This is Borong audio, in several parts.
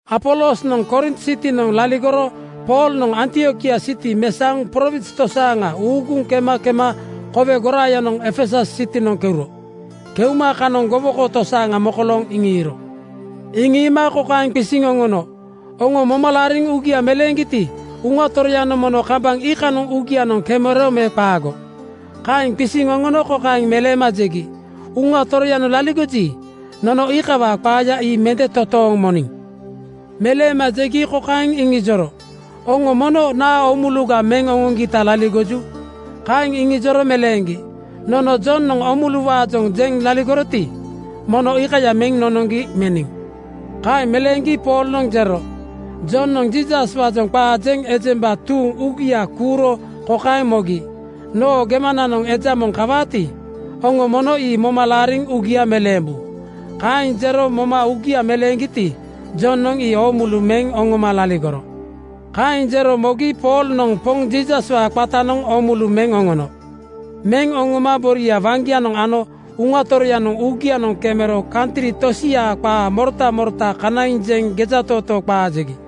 Apolosnoŋ Korint sitinoŋ laligoro Poolnoŋ Antiokia siti mesaoŋ prowins tosaaŋa uuguŋ kema kema kowe goraayanoŋ Efesus sitinoŋ keuro. Keuma kanoŋ gowoko tosaaŋa mokolooŋ iŋiiro. Iŋiima kokaeŋ qisiŋ oŋono, “Oŋo moma laariŋ uugia meleeŋgiti, Uŋa Toroyanoŋ mono kambaŋ iikanoŋ uugianoŋ kemero me qaago?” Kaeŋ qisiŋ oŋono kokaeŋ meleema jegi, “Uŋa Toroyanoŋ laligoji, nono iikawaa qaaya ii mende totooŋ moniŋ.” Meleema jegi kokaeŋ iŋijoro, “Oŋo mono naa oomuluga meŋ oŋoŋgita laligoju?” Kaeŋ iŋijoro meleeŋgi, “Nono Jonoŋ oomuluwaajoŋ jeŋ laligoroti, mono iikaya meŋ nonoŋgi meniŋ.” Kaeŋ meleeŋgi Poolnoŋ jero, “Jonoŋ Jiisaswaajoŋ qaa jeŋ ejemba tuuŋ uugia kuuro kokaeŋ mogi, ‘Noo gemananoŋ eja moŋ kawaati, oŋo mono ii moma laariŋ uugia meleembu.’ Kaeŋ jero moma uugia meleeŋgiti, Jonoŋ ii oomulu meŋ oŋoma laligoro.” Kaeŋ jero mogi Poolnoŋ Poŋ Jiisaswaa qatanoŋ oomulu meŋ oŋono. Meŋ oŋoma boria waŋgianoŋ ano Uŋa Toroyanoŋ uugianoŋ kemero kantri tosiaa qaa morota morota kanaiŋ jeŋ gejatootoo qaa jegi.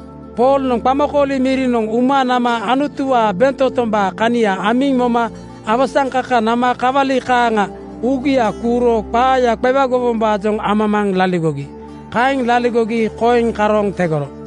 Poolnoŋ qamakooli mirinoŋ uma nama Anutuwaa bentotombaa kania amiŋ moma awasaŋkaka nama kawali kaaŋa uugia kuuro qaaya qewagowombaajoŋ amamaaŋ laligogi. Kaeŋ laligogi koiŋ karooŋ tegoro.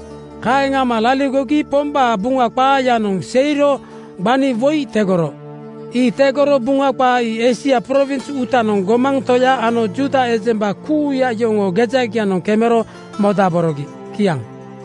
Kaeŋ ama laligogi Pombaa Buŋa qaayanoŋ seiro gbani woi tegoro. Ii tegoro Buŋa qaa ii Eisia prowins uutanoŋ gomaŋ toya ano Juuda ejemba kuuya yoŋoo gejagianoŋ kemero modaborogi. Kiaŋ.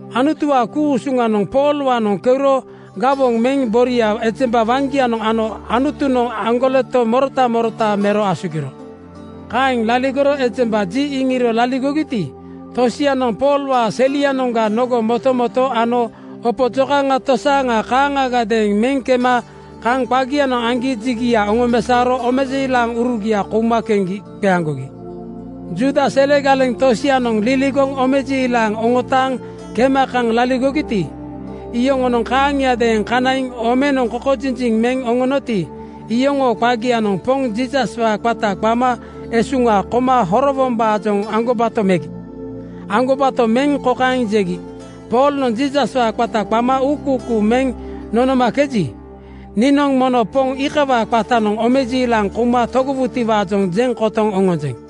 Anutuwaa ku-usuŋanoŋ Poolwaanoŋ keuro gawoŋ meŋ boria ejemba waŋgianoŋ ano Anutunoŋ aŋgoleto morota morota mero asugiro. Kaeŋ laligoro ejemba ji iŋiro laligogiti, tosianoŋ Poolwaa selianoŋga nogo motomoto ano opo jokaŋa tosaaŋa kaaŋagadeeŋ meŋ kema kaŋ qagianoŋ aŋgi jigia oŋomesaoro omejiilaŋurugia kouma keŋgi qeaŋgogi. Juuda sele galeŋ tosianoŋ liligoŋ omejiilaŋ oŋotaaŋ kema kaŋ laligogiti, iyoŋonoŋ kaaŋiadeeŋ kanaiŋ omenoŋ kokojinjiŋ meŋ oŋoŋgiti, iyoŋoo qagianoŋ Poŋ Jiisaswaa qata qama esuŋa koma horowombaajoŋ aŋgobato megi. Aŋgobato meŋ kokaeŋ jegi, “Poolnoŋ Jiisaswaa qata qama uukuukuu meŋ nonomakeji, niinoŋ mono Poŋ iikawaa qatanoŋ omejiilaŋ kouma togowutiwaajoŋ jeŋ kotoŋ oŋonjeŋ.”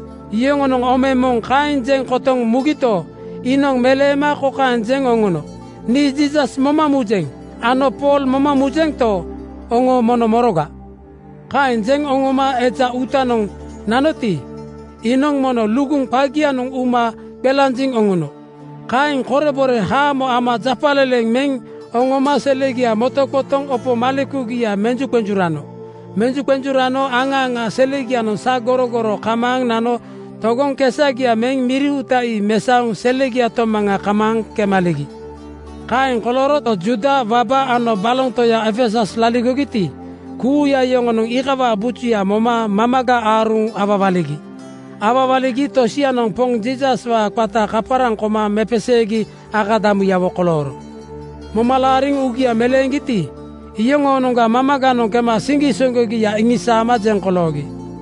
Yoŋonoŋ ome moŋ kaeŋ jeŋ kotoŋ mugito, iinoŋ meleema kokaeŋ jeŋ oŋono, “Nii Jiisas moma mujeŋ ano Pool moma mujento, oŋo mono moroga?” Kaeŋ jeŋ oŋoma eja uutanoŋ nanoti, iinoŋ mono luguŋ qagianoŋ uma qelanjiŋ oŋono. Kaeŋ korebore haamo ama japaleleŋ meŋ oŋoma selegia motoqotoŋ opo malekugia menjuqenjurano. Menjuqenjurano aŋa aŋa selegianoŋ sagorogoro kamaaŋ nano togoŋ kesagia meŋ miri uuta ii mesaoŋ selegia tomaŋa kamaaŋ kemaligi. Kaeŋ kolooro Juuda waba ano baloŋ toya Efesus laligogiti, kuuya yoŋonoŋ iikawaa bujuya moma mamaga aaruŋ awawaligi. Awawaligi tosianoŋ Poŋ Jiisaswaa qata kaparaŋ koma mepeseegi akadamuyawo kolooro. Moma laariŋ uugia meleeŋgiti, iyoŋoonoŋga mamaganoŋ kema siŋgisoŋgogia iŋisaama jeŋ koloogi.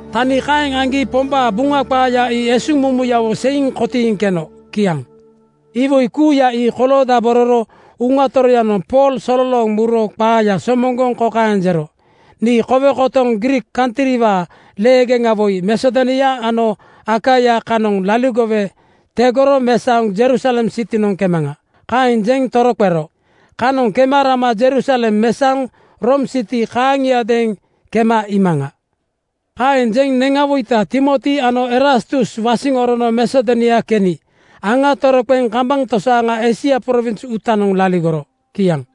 Tani kaeŋ aŋgi Pombaa Buŋa qaaya ii esuŋmumuyawo seiŋ kotiiŋ keno. Kiaŋ. Iwoi kuuya ii koloodabororo Uŋa Toroyanoŋ Pool sololooŋ muro qaaya somoŋgoŋ kokaeŋ jero, “Nii kowe kotoŋ Griik kantriwaa leegeŋa woi Masedonia ano Akaia kanoŋ liligowe tegoro mesaoŋ Jerusalem sitinoŋ kemaŋa.” Kaeŋ jeŋ toroqero, “Kanoŋ kema rama Jerusalem mesaoŋ Room siti kaaŋiadeeŋ kema iimaŋa.” Kaeŋ jeŋ neŋawoita Timoti ano Erastus wasiŋ orono Masedonia keni aŋa toroqeŋ kambaŋ tosaaŋa Eisia prowins uutanoŋ laligoro. Kiaŋ.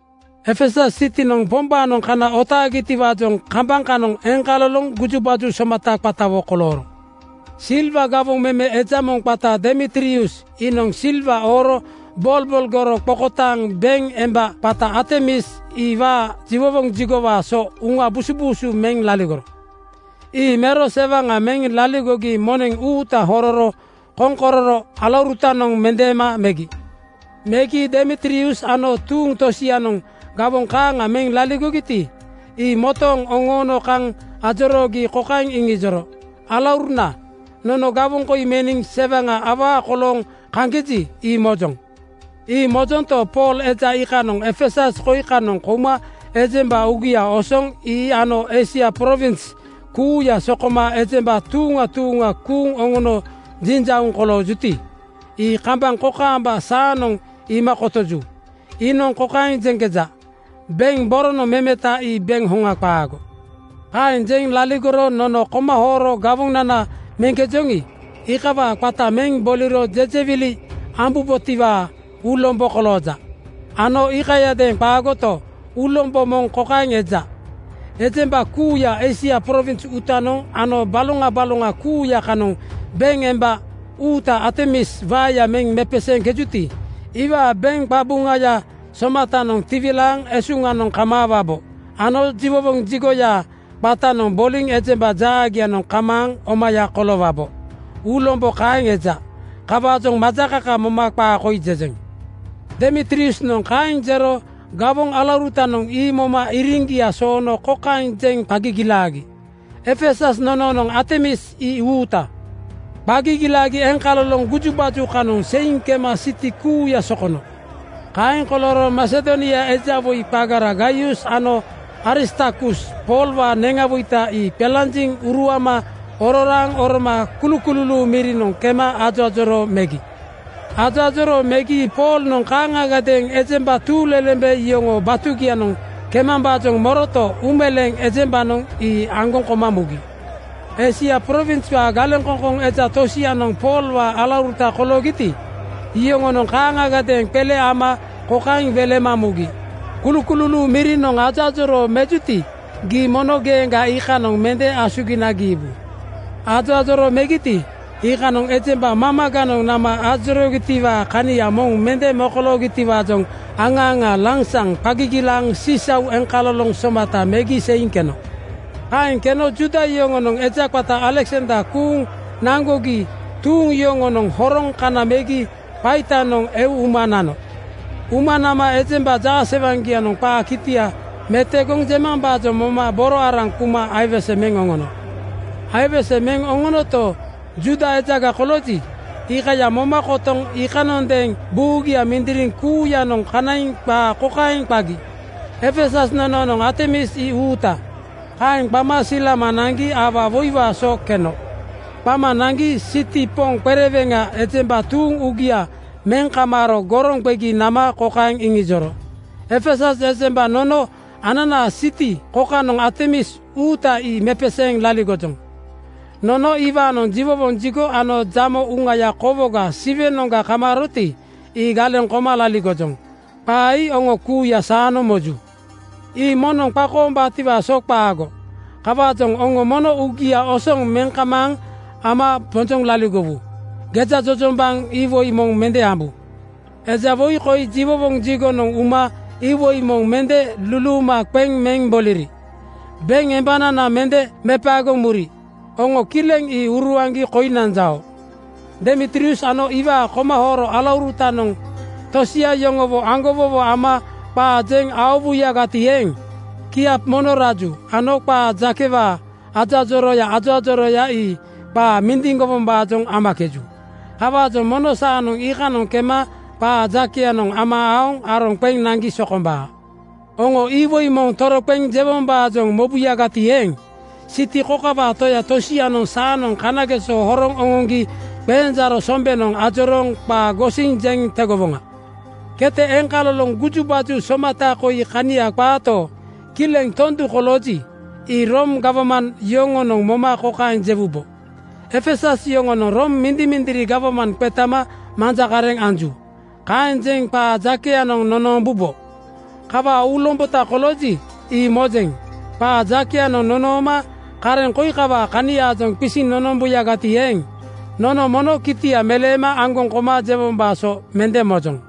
Efesus sitinoŋ Pombaanoŋ kana otaagitiwaajoŋ kambaŋ kanoŋ eŋkaloloŋ gujubaju somata qatawo kolooro. Silwa gawoŋ meme eja moŋ qata Demitrius iinoŋ silwa ooro bolbolgoro qokotaaŋ beŋ emba qata Artemis iwaa jiwowoŋ jigowaa so uŋa busubuusu meŋ laligoro. Ii mero sewaŋa meŋ laligogi moneŋ uuta hororo koŋkororo alaurutanoŋ mendeema megi. Megi Demitrius ano tuuŋ tosianoŋ gawoŋ kaaŋa meŋ laligogiti, ii motooŋ oŋoono kaŋ ajoroogi kokaeŋ iŋijoro, “Alauruna, nono gawoŋ koi meniŋ sewaŋa awaa kolooŋ kaŋkeji, ii mojoŋ. Ii mojonto, Pool eja iikanoŋ Efesus koi kanoŋ kouma ejemba uugia osoŋ ii ano Eisia prowins kuuya sokoma ejemba tuuŋa tuuŋa kuuŋ oŋono jinjauŋ koloojuti, ii kambaŋ kokaamba saanoŋ iima kotoju. Iinoŋ kokaeŋ jeŋkeja, ‘Beŋ boronoŋ memeta ii beŋ hoŋa qaago.’ “Kaeŋ jeŋ laligoro nono komahooro gawonana meŋkejoŋi, iikawaa qata meŋ boliro jejewili ambubotiwaa uulombo kolooja. Ano iikayadeeŋ qaagoto, uulombo moŋ kokaeŋ eja: Ejemba kuuya Eisia prowins uutanoŋ ano baloŋa baloŋa kuuya kanoŋ beŋ emba uuta Artemis waeya meŋ mepeseeŋkejuti, iwaa beŋ qabuŋaya somatanoŋ tiwilaaŋ esuŋanoŋ kamaawabo ano jiwowoŋ jigoyaa qatanoŋ boliŋ ejemba jaagianoŋ kamaaŋ omaya koloowabo. Uulombo kaeŋ eja. Kawaajoŋ majakaka moma qaa koi jejeŋ.” Demitriusnoŋ kaeŋ jero gawoŋ alaurutanoŋ ii moma iriŋgia soono kokaeŋ jeŋ qa gigilaagi, “Efesus nonoonoŋ Artemis ii uuta!” Qa gigilaagi eŋkaloloŋ gujubaju kanoŋ seiŋ kema siti kuuya sokono. Kaeŋ kolooro Masedonia eja woi qagara Gaius ano Aristarkus Poolwaa neŋawoita ii qelanjiŋ uruama ororaaŋ oroma kulukululuu mirinoŋ kema ajoajoroo megi. Ajoajoroo megi Poolnoŋ kaaŋagadeeŋ ejemba tuuŋlelembe yoŋoo batugianoŋ kemambaajoŋ moroto, uumeleeŋ ejembanoŋ ii aŋgoŋ koma mugi. Eisia prowinswaa galeŋkoŋkoŋ eja tosianoŋ Poolwaa alauruta koloogiti, iyoŋonoŋ kaaŋagadeeŋ qele ama kokaeŋ welema mugi, “Kulukululuu mirinoŋ ajoajoroo mejuti, gii mono geeŋga iikanoŋ mende asugina giibu.” Ajoajoroo megiti, iikanoŋ ejemba mamaganoŋ nama ajoroogitiwaa kania moŋ mende mogitiwaajoŋ aŋa aŋa lansaŋ qa gigilaaŋ sisau eŋkaloloŋ somata megi seiŋ keno. Kaeŋ keno Juuda yoŋonoŋ eja qata Aleksander kuuŋ naŋgogi tuuŋ yoŋonoŋ horoŋ kana megi qaitanoŋ eu uma nano. Uma nama ejemba jaasewaŋgianoŋ qaa kitia metogoŋ jemambaajoŋ moma boro araŋ kuma aiwese meŋ oŋono. Aiwese meŋ oŋonoto, Juuda ejaga kolooji, iikaya moma kotoŋ iikanondeeŋ buugia mindiriŋ kuuyanoŋ kanaiŋ qaa kokaeŋ qagi, “Efesus nonoonoŋ Artemis ii uuta!” Kaeŋ qama silama naŋgi aua woiwaa so keno. Qama naŋgi siti (klaak) poŋ qereweŋanoŋ ejemba tuuŋ uugia meŋ kamaaro goroŋ qegi nama kokaeŋ iŋijoro, “Efesus ejemba, nono ananaa siti kokanoŋ Artemis uuta ii mepeseeŋ laligojoŋ. Nono iwaanoŋ jiwowoŋ jigo ano jamo uŋaya kowoga Siwenoŋga kamaaroti, ii galeŋ koma laligojoŋ. Qaa ii oŋo kuuya saanoŋ moju. Ii moŋnoŋ qakoombaatiwaa so qaago. Kawaajoŋ oŋo mono uugia osoŋ meŋ kamaaŋ ama bonjoŋ laligowu. Gejajojombaŋ iwoi moŋ mende ambu. Eja woi koi jiwowoŋ jigonoŋ uma iwoi moŋ mende luluuma qeŋ meŋ boliri. Beŋ embanana mende mepaegoŋ muri. Oŋo kileŋ ii uruaŋgi koi nanjao. “Demitrius ano iwaa komahooro alaurutanoŋ tosia yoŋowo aŋgowowo ama qaa jeŋ aowuyagati eeŋ, kiap mono raju ano qaa jakewaa ajoajorooya ajoajorooya ii qaa mindiŋgowombaajoŋ amakeju. Kawaajoŋ mono saanoŋ iikanoŋ kema qaa jakeyanoŋ ama aoŋ aroŋ qeŋ naŋgi sokombaa. Oŋo iwoi moŋ toroqeŋ jewombaajoŋ mobuyagati eeŋ, siti kokawaa toya tosianoŋ saanoŋ kanageso horoŋ oŋoŋgi qenjaaro sombenoŋ ajorooŋ qaa gosiŋ jeŋ tegowoŋa. Kete eŋkaloloŋ gujubaju somata koi kania qaato, kileŋ tondu kolooji, ii Room gawman yoŋonoŋ moma kokaeŋ jewubo, ‘Efesus yoŋonoŋ Room mindimindiri gawman qetama manja kareŋ anju.’ Kaeŋ jeŋ qaa jakeyanoŋ nonoombubo. Kawaa uulombota kolooji, ii mojeŋ. Qaa jakeyanoŋ nonooma kareŋ koi kawaa kaniaajoŋ qisiŋ nonombuyagati eeŋ, nono mono kitia meleema aŋgoŋ koma jewombaa so mende mojoŋ.”